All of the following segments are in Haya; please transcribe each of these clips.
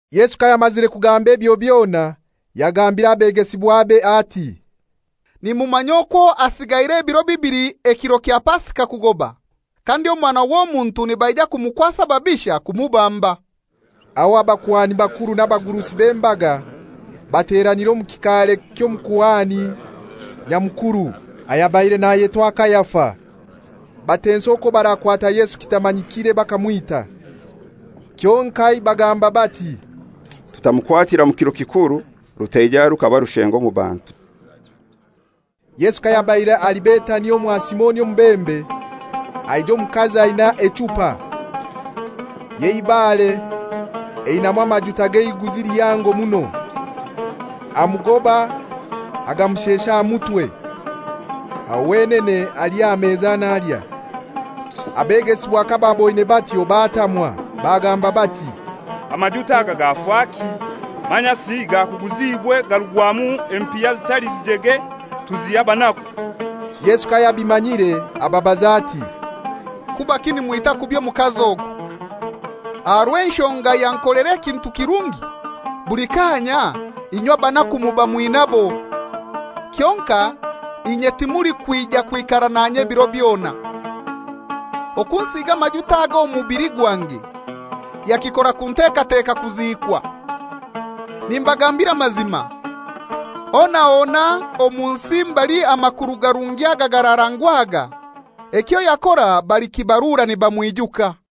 Yesu kayamazire kugamba ebyo byona, yagambira abegesibwabe ati, «Nimumanya akwo hasigaire ebiro bibili ekiro kya Pasika kugoba, kandi Omwana w'Omuntu nibaija kumukwasa ababisha kumubamba.» Aho abakuhani bakuru n'abagurusi b'embaga bateranira omu kikaare ky'Omukuhani Nyamukuru ayabaire nayetwa Kaifa, batensa okwo barakwata Yesu kitamanyikire bakamwita. Kyonkai bagamba bati, «Tutamukwatira mu kiro kikuru, rutaija rukaba rushengo omu bantu.» Yesu kayabaire ali Betania omwa Simoni omubembe, haija omukazi aina echupa y'eibare einamu amajuta g'eiguzi lihango muno, amugoba agamushesha aha mutwe, aho wenene ali aha meza nalya. Abegesibwa kabaaboine batyo batamwa, bagamba bati, «Amajuta aga gafaki? Manyasi gakuguziibwe garugwamu empiha zitali zijege tuziha abanaku.» Yesu kayabimanyire ababaza ati, «Kubaki nimwita kubi omukazi ogu? Aha rw'enshonga yankolera ekintu kirungi. Buli kaanya inywe abanaku muba mwinabo, kyonkai inye timulikwija kwikara nanye biro byona. Okunsiiga amajuta aga omubili gwange, yakikora kuntekateka kuziikwa. Nimbagambira amazima, hona hona omu nsi mbali amakuru garungi aga gararangwaga, ekyo yakora balikibarura nibamwijuka.»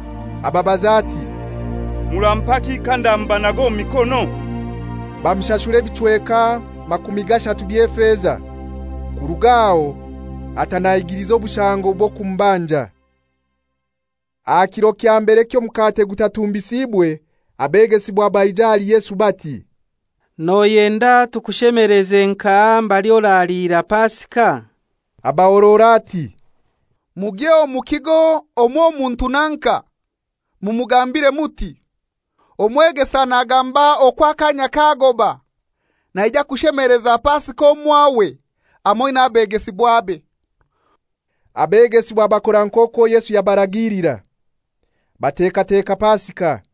ababaza ati, «Murampaki kandamubanaga omu mikono?» Bamushashura ebichweka makumi gashatu by'efeza. Kuruga aho ata nahigiliza obushango bw'okumubanja. Aha kiro kya mbere ky'Omukate Gutatumbisiibwe, abegesibwa baija ahali Yesu bati, «Noyenda tukushemeleze nkahai mbali oraliira Pasika?» Abahorora ati, «Mugye omu kigo omw'Omuntu nanka, mumugambire muti, ‹Omwegesa nagamba okwo akanya kagoba; naija kushemeleza Pasika omwawe hamoi n'abegesibwabe.›» Abegesibwa bakora nk'okwo Yesu yabaragiilira, batekateka Pasika.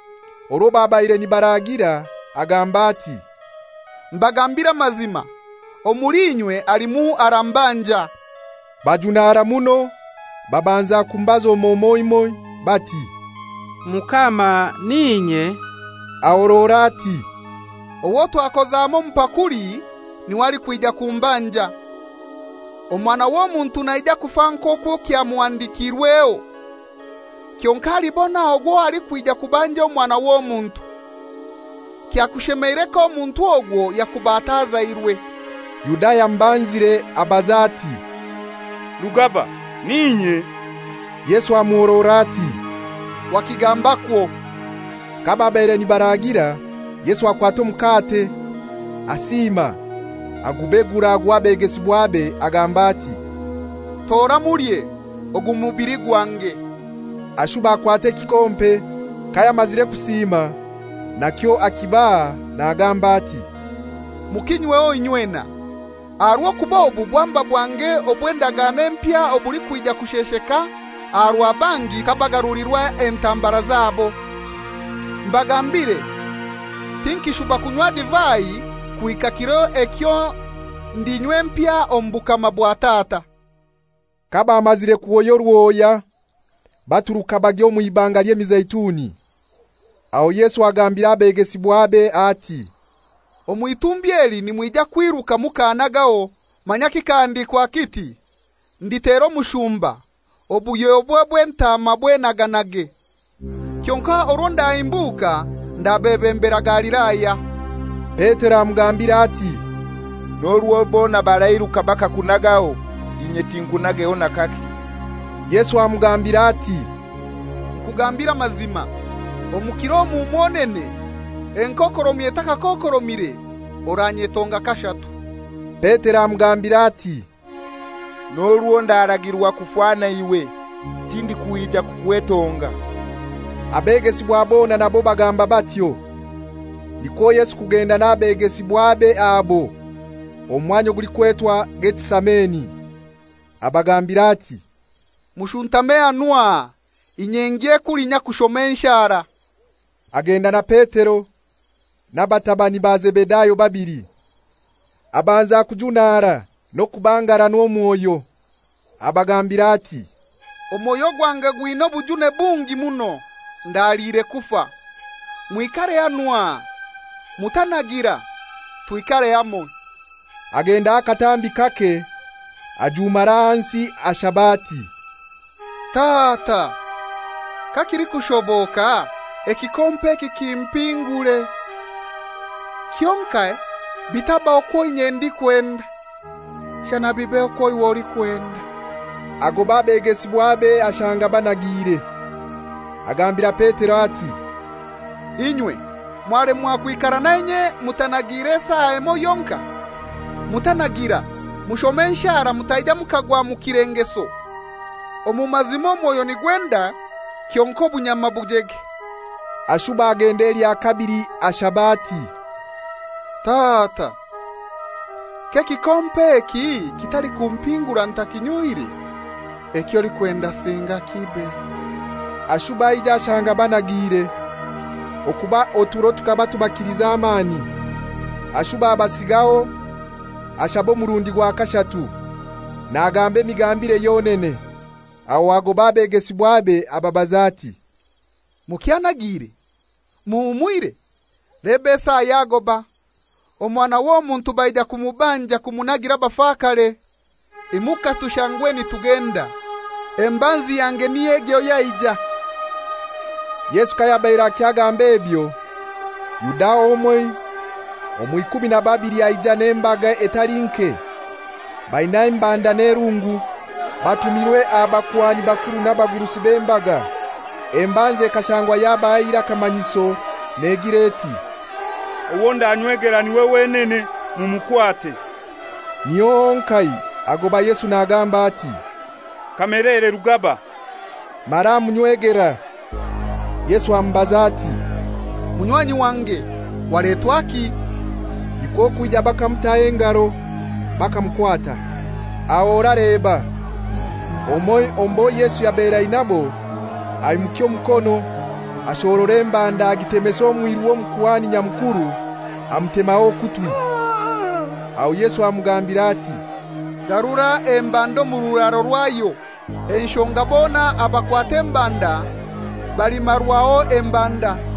Orwo babaire nibaraagira agamba ati, «Mbagambiire amazima, omuli inywe halimu arambanja.» Bajumara muno, babanza kumubaza omoi omoi bati, «Mukama n'inye?» Ahorora ati, «Owo twakoza hamoi omu pakuli niwe alikwija kumbanja. Omwana w'Omuntu naija kufa nk'okwo kyamuhandikirweho, kyonkai alibona ogwo alikwija kubanja Omwana w'Omuntu! Kyakushemeire k'omuntu ogwo yakuba atazairwe.» Yuda ayamubanzire abaza ati, «Rugaba n'inye?» Yesu amuhorora ati, «Wakigambakwo!» Kababaire nibaragira, Yesu akwata omukate, asiima, agubegura, aguha abegesibwabe agamba ati, «Tora mulye; ogu mubili gwange.» Ashuba akwata ekikompe, kayamazire kusiima nakyo akibaha nagamba ati, «Mukinyweho inywena; aha rw'okuba obu bwamba bwange obw'endagano empya obulikwija kushesheka aha rwa bangi kabagarulirwa entambara zabo. Mbagambiire, tinkishuba kunywa divai kuhika kiro ekyo ndinywa empya omu bukama bwa Tata.» Kabamazire kuhoya oruhoya baturuka bagya omw'ibanga ly'Emizeituni. Aho Yesu agambira abegesibwabe ati, «Omw'itumbi eli nimwija kwiruka mukannagaho. Manya kikahandikwa kiti, ‹Nditera omushumba, obuhyobwe bw'entaama bwenaganage.›» «Kyonkai orwo ndahimbuka ndabebembera Galilaya.» Petero amugambira ati, «N'orwo bona barairuka bakakunagaho, inye tinkunageho n'akake.» Yesu amugambira ati, «Nkugambire amazima, omu kiro omu mwonene, enkokoromi etakakokoromire, oranyetonga kashatu.» Petero amugambira ati, «N'orwo ndaragirwa kufa na iwe, tindikwija kukwetonga.» Abegesibwa bona nabo bagamba batyo. Nikwo Yesu kugenda n'abegesibwabe abo omu mwanya ogulikwetwa Getisameni, abagambira ati, «Mushuntame hanu aha, inye ngye kulinya kushoma enshara.» Agenda na Petero na batabani ba Zebedayo babili, abanza kujunaara n'okubangaranwa omwoyo. Abagambira ati, «Omwoyo gwange gwina obujune bungi muno, ndaliire kufa. Mwikare hanu aha. Mutanagira, twikare hamoi.» Agendaho akatambi kake ajumara ahansi ashaba ati, «Tata, kakilikushoboka ekikompe eki kimpingure; kyonkai bitaba kwo inye ndikwenda, shana bibe okwo iwe olikwenda.» Agoba abegesibwabe ashanga banagiire. Agambira Petero ati, «Inywe mwalemwa kwikara nanye mutanagiire esaa emoi yonkai? Mutanagira, mushome enshara mutaija mukagwa omu kilengeso. Omu mazima omwoyo nigwenda kyonkai obunyama bujege.» Ashuba agenda elya kabili ashaba ati, «Tata, k'ekikompe eki kitalikumpingura ntakinyoire, eky'olikwenda singa kibe.» Ashuba aija ashanga banagiire, okuba oturo tukaba tubakilize amani. Ashuba abasigaho ashaba omurundi gwa kashatu, nagamba emigambire yonene. Aho agoba abegesibwabe ababaza ati, «Mukyanagiire, muhumwire? Leba esaa yagoba, Omwana w'Omuntu baija kumubanja kumunagira abafakare. Imuka tushangwe nitugenda, leba embanzi yange niy'egyo yaija.» Yesu kayabaire akyagamb'ebyo, Yuda omoi omw'ikumi na babili aija n'embaga etali nke baina embanda n'erungu, batumirwe abakuhani bakuru n'abagurusi b'embaga. Embanzi ekashangwa yabahaire akamanyiso negira eti, «Owo ndanywegera niwe wenene, mumukwate.» Niho honkai agoba Yesu nagamba ati, «Kamelere Rugaba!» Mara amunywegera. Yesu amubaza ati, «Munywanyi wange, waletwaki?» Nikwo kwija bakamutaho engaro, bakamukwata. Aho oraleba! Omoi omu bo Yesu yabaire ainabo aimukya omukono ashohorora embanda agitemesa omwiru w'Omukuhani Nyamukuru amutemaho okutwi. Aho Yesu amugambira ati, «Garura embanda omu kiraro kyayo. Enshonga bona abakwata embanda balimarwaho embanda.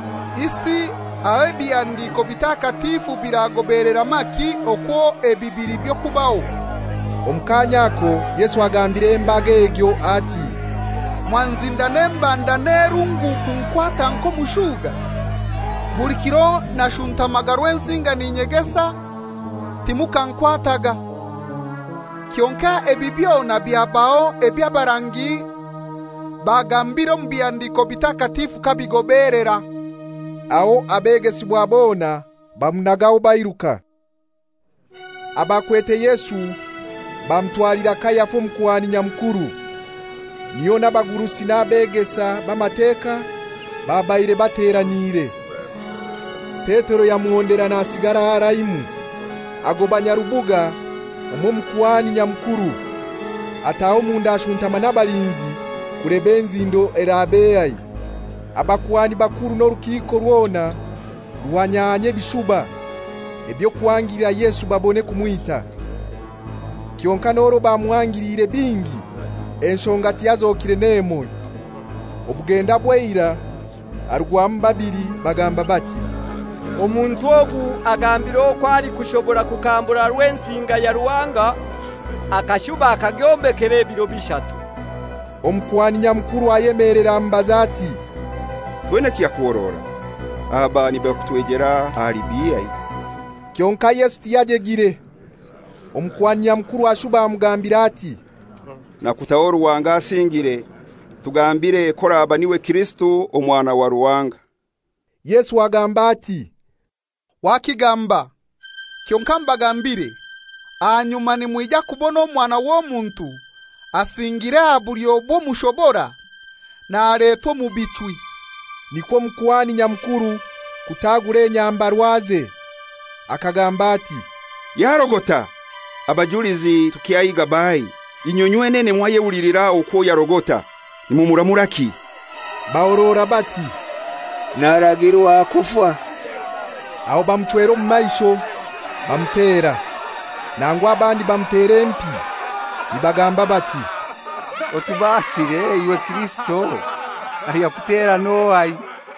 Isi aho ebihandiko bitakatifu biragobelera maki okwo ebi bili by'okubaho?» Omu kaanya ako Yesu agambira embaga egyo ati, «Mwanzinda n'embanda n'erungu kunkwata nk'omushuga? Buli kiro nashuntamaga Rwensinga n'inyegesa, timukankwataaga. Kyonkai ebi byona byabaho eby'abarangi bagambire omu bihandiko bitakatifu kabigobelera.» Aho abegesibwa bona bamunagaho, bairuka. Abakwete Yesu bamutwalira Kayafa Omukuhani Nyamukuru, niho n'abagurusi n'abegesa b'Amateka babaire bateraniire. Petero yamuhondera nasigara haraimu, agoba nyarubuga omw'Omukuhani Nyamukuru, ataha omunda ashuntama n'abalinzi kuleba enzindo erab'ehai. Abakuhani bakuru n'orukiiko rwona ruhanyahanyia ebishuba eby'okuhangilira Yesu babone kumwita. Kyonkai n'orwo bamuhangiliire bingi enshonga tiyazokire n'emoi. Obugenda bw'eirai harugwamu babili bagamba bati, «Omuntu ogu agambire okwo alikushobora kukambura Rwensinga ya Ruhanga, akashuba akagyombekera ebiro bishatu.» Omukuhani Nyamukuru ayemelera amubaza ati, «Toina kyakuhorora? Aba nibakutoijera ahali bihai?» Kyonkai Yesu tiyajegire. Omukuhani Nyamukuru ashuba amugambira ati, «Nakutaho Ruhanga asingiire, tugambire k'oraba niwe Kirisito Omwana wa Ruhanga!» Yesu agamba ati, «Wakigamba. Kyonkai mbagambire, ahanyuma nimwija kubona Omwana w'Omuntu asingiire aha bulyo bw'Omushobora, naletwa omu bichwi.» Nikwo Omukuhani Nyamukuru kutagura enyambarwaze akagamba ati, «Yarogota! Abajulizi tukyahiiga baahai? Inywe nywenene mwayehulilira okwo yarogota. Nimuramuraki?» Bahorora bati, «Naragirwa kufa.» Aho bamuchwera omu maisho, bamutera. Nangu abandi bamutera empi nibagamba bati, «Otubaasire, iwe Kirisito! Ayakutera n'ohai?»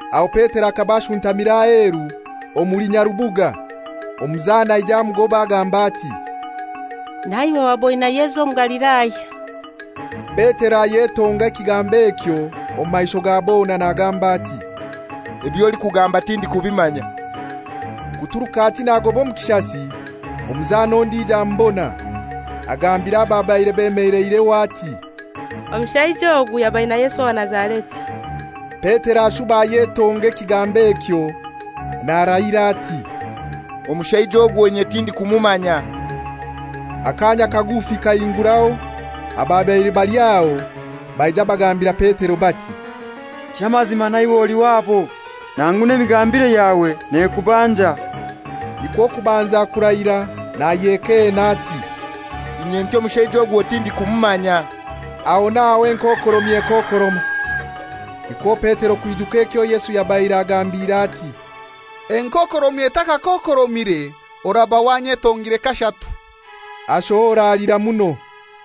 Aho Petero akaba ashuntamire aheru omuli nyarubuga. Omuzana aija amugoba agamba ati, «Naiwe waba oina Yesu Omugalilaya.» Petero ayetonga ekigambo ekyo omu maisho ga bona, nagamba ati, «Eby'olikugamba tindikubimanya.» Kuturuka ati nagoba omu kishasi omuzana ondijo amubona, agambira ababaire bemeleireho ati, «Omushaija ogu yaba aina Yesu owa Nazareti.» Petero ashuba ayetonga ekigambo ekyo narahira ati, «Omushaija ogwo inye tindikumumanya.» Akaanya kagufi kahinguraho ababaire bali aho baija bagambira Petero bati, «Ky'amazima naiwe oli wabo; nangu n'emigambire yawe nekubanja.» Nikwo kubanza kurahira nayekeena ati, «Inye nti omushaija ogwo tindikumumanya.» Aho n'aho enkokoromi ekookoroma. Nikwo Petero kwijuka ekyo Yesu yabaire agambire ati, «Enkokoromi etakakokoromire oraba wanyetongire kashatu.» Ashohora alira muno.